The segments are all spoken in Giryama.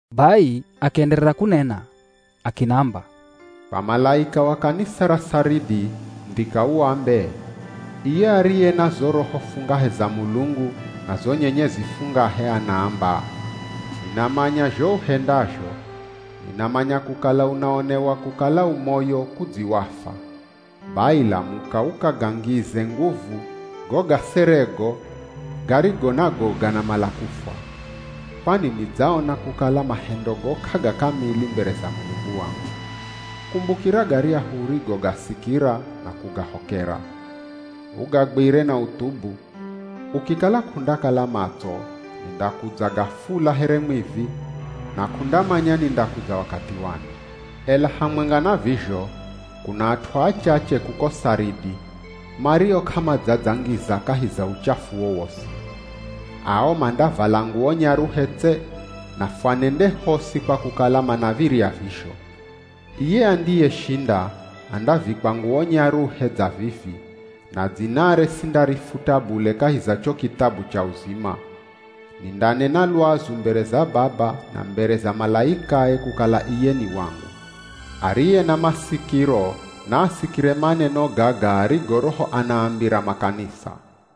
Bai akienderera kunena akinamba, “Kwa malaika wa kanisa ra Saridi, ndhika uambe, ‘Iye ariye na zo roho fungahe za Mulungu, na zo nyenyezi fungahe anaamba: Ninamanya zho uhendazho. Ninamanya kukala unaonewa kukala u moyo kudzi wafwa. Bai lamuka ukagangize nguvu go gaserego garigo nago ganamala kufwa. Kwani nidzaona kukala mahendogo k'agakamili mbere za Mulungu wangu. Kumbukira garyahu urigogasikira na kugahokera. Ugagwire na uthubu. Ukikala k'undakala matso, nindakudza gafula here mwivi, na k'undamanya nindakudza wakathi wani. Ela hamwenga na vizho kuna at'u achache kuko Saridi, mario k'amadzadzangiza kahi za uchafu wowosi. Ao mandavala nguwo nyaruhe tse, na fwanende hosi kwa kukala manav̱irya vizho. Iye andiyeshinda, andavikwa nguwo nyaruhe dza vivi, na dzinare sindarifuta bule kahi za cho kithabu cha uzima. Nindanena lwazu mbere za Baba na mbere za malaikae kukala iye ni wangu. Ariye na masikiro naasikire maneno gaga arigo roho anaambira makanisa.’”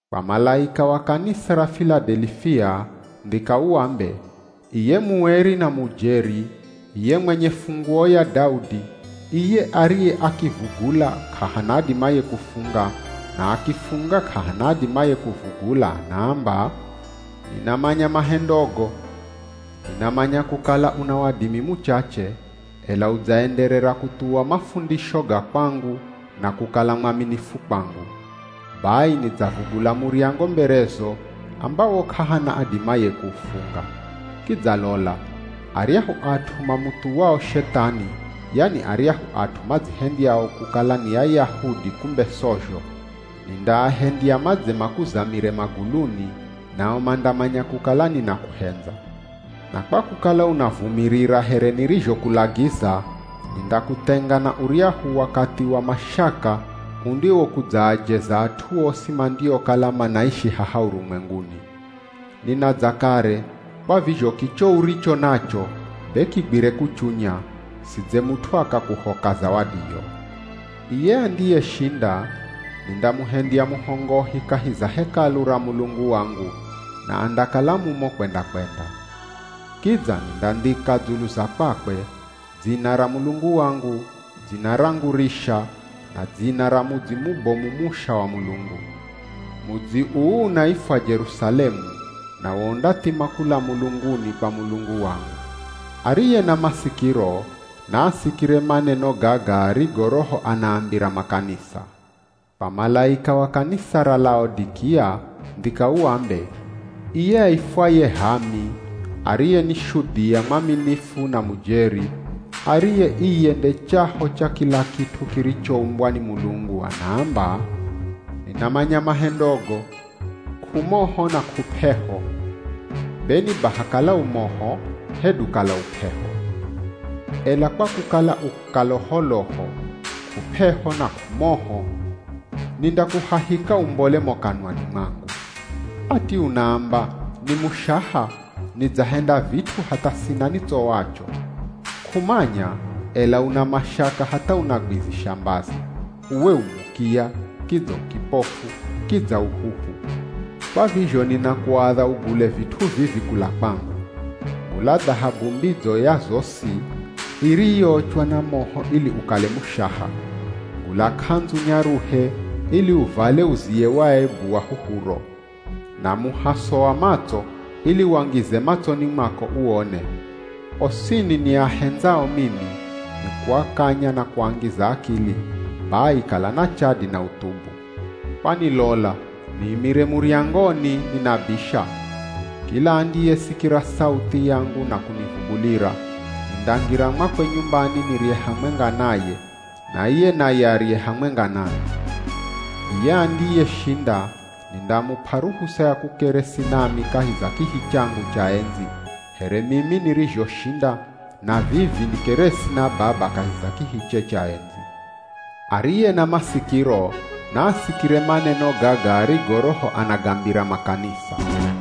“Kwa malaika wa kanisa ra Filadelifia, ndhika uambe, ‘Iye mueri na mujeri, iye mwenye funguo ya Daudi, iye ariye akivugula, k'ahana adimaye kufunga, na akifunga k'ahana adimaye kuvugula, anaamba: Ninamanya mahendogo. Ninamanya kukala una wadimi muchache, ela udzaenderera kuthuwa mafundisho ga kwangu na kukala mwaminifu kwangu. Bai nidzavugula muryango mberezo, ambawo k'ahana adimaye kuufunga. Kidza lola, aryahu at'u mamuthuwao Shethani, yani aryahu at'u madzihendyao kukala ni Ayahudi kumbe sozho, nindaahendya madze makuzamire maguluni, nao mandamanya kukala ninakuhendza. Na kwa kukala unavumirira here nirizhokulagiza, nindakuthenga na uryahu wakathi wa mashaka undiwokudzaajeza at'u osi mandiokala manaishi haha urumwenguni. Ninadza kare, kwa vizho kicho uricho nacho be kigwire kuchunya, sidze mut'u akakuhoka zawadiyo. Iye andiyeshinda, nindamuhendya muhongohi kahi za Hekalu ra Mulungu wangu, na andakala mumo kwenda-kwenda. Kidza, nindandhika dzulu za kwakwe: Dzina ra Mulungu wangu, dzina rangu risha, na dzina ra mudzi mubomu musha wa Mulungu. Mudzi uu unaifwa Jerusalemu, nawo undathima kula mulunguni kwa Mulungu wangu. Ariye na masikiro, naasikire maneno gaga arigo roho anaambira makanisa.’” “Kwa malaika wa kanisa ra Laodikia, ndhika uambe, ‘Iye aifwaye H'aami, ariye ni Shudhia mwaminifu na mujeri, ariye iye nde chaho cha kila kit'u kirichoumbwa ni Mulungu, anaamba: Ninamanya mahendogo. K'umoho na k'up'eho. Be ni baha kala u moho, hedu kala u p'eho. Ela kwa kukala u kaloholoho, k'up'eho na k'umoho, nindakuhahika umbole mo kanwani mwangu. Ati unaamba “Ni mushaha, nidzahenda vit'u hatha sina nitsowacho.” K'umanya, ela una mashaka hatha unagwizisha mbazi. Uwe u mukiya, kidza u kipofu, kidza u huhu. Kwa vizho ninakuadha ugule vit'u vivi kula kwangu: gula dhahabu mbidzo ya zosi, iriyoochwa na moho ili ukale mushaha; gula k'andzu nyaruhe ili uvale uziye waebu wa huhuro; na muhaso wa matso ili wangize matsoni mwako uone. Osini niahendzao mimi, nikuakanya na kuangiza akili. Bai kala na chadi na uthubu. Kwani lola niimire muryangoni ninabisha. Kila andiyesikira sauthi yangu na kunivugulira, nindangira mwakwe nyumbani nirye hamwenga naye, na iye naye arye hamwenga nami. Iye andiyeshinda, nindamup'a ruhusa ya kukeresi nami kahi za kihi changu cha endzi, here mimi nirizhoshinda, na vivi nikeresi na Baba kahi za kihiche cha endzi. Ariye na masikiro naasikire maneno gaga arigo Roho anagambira makanisa.’”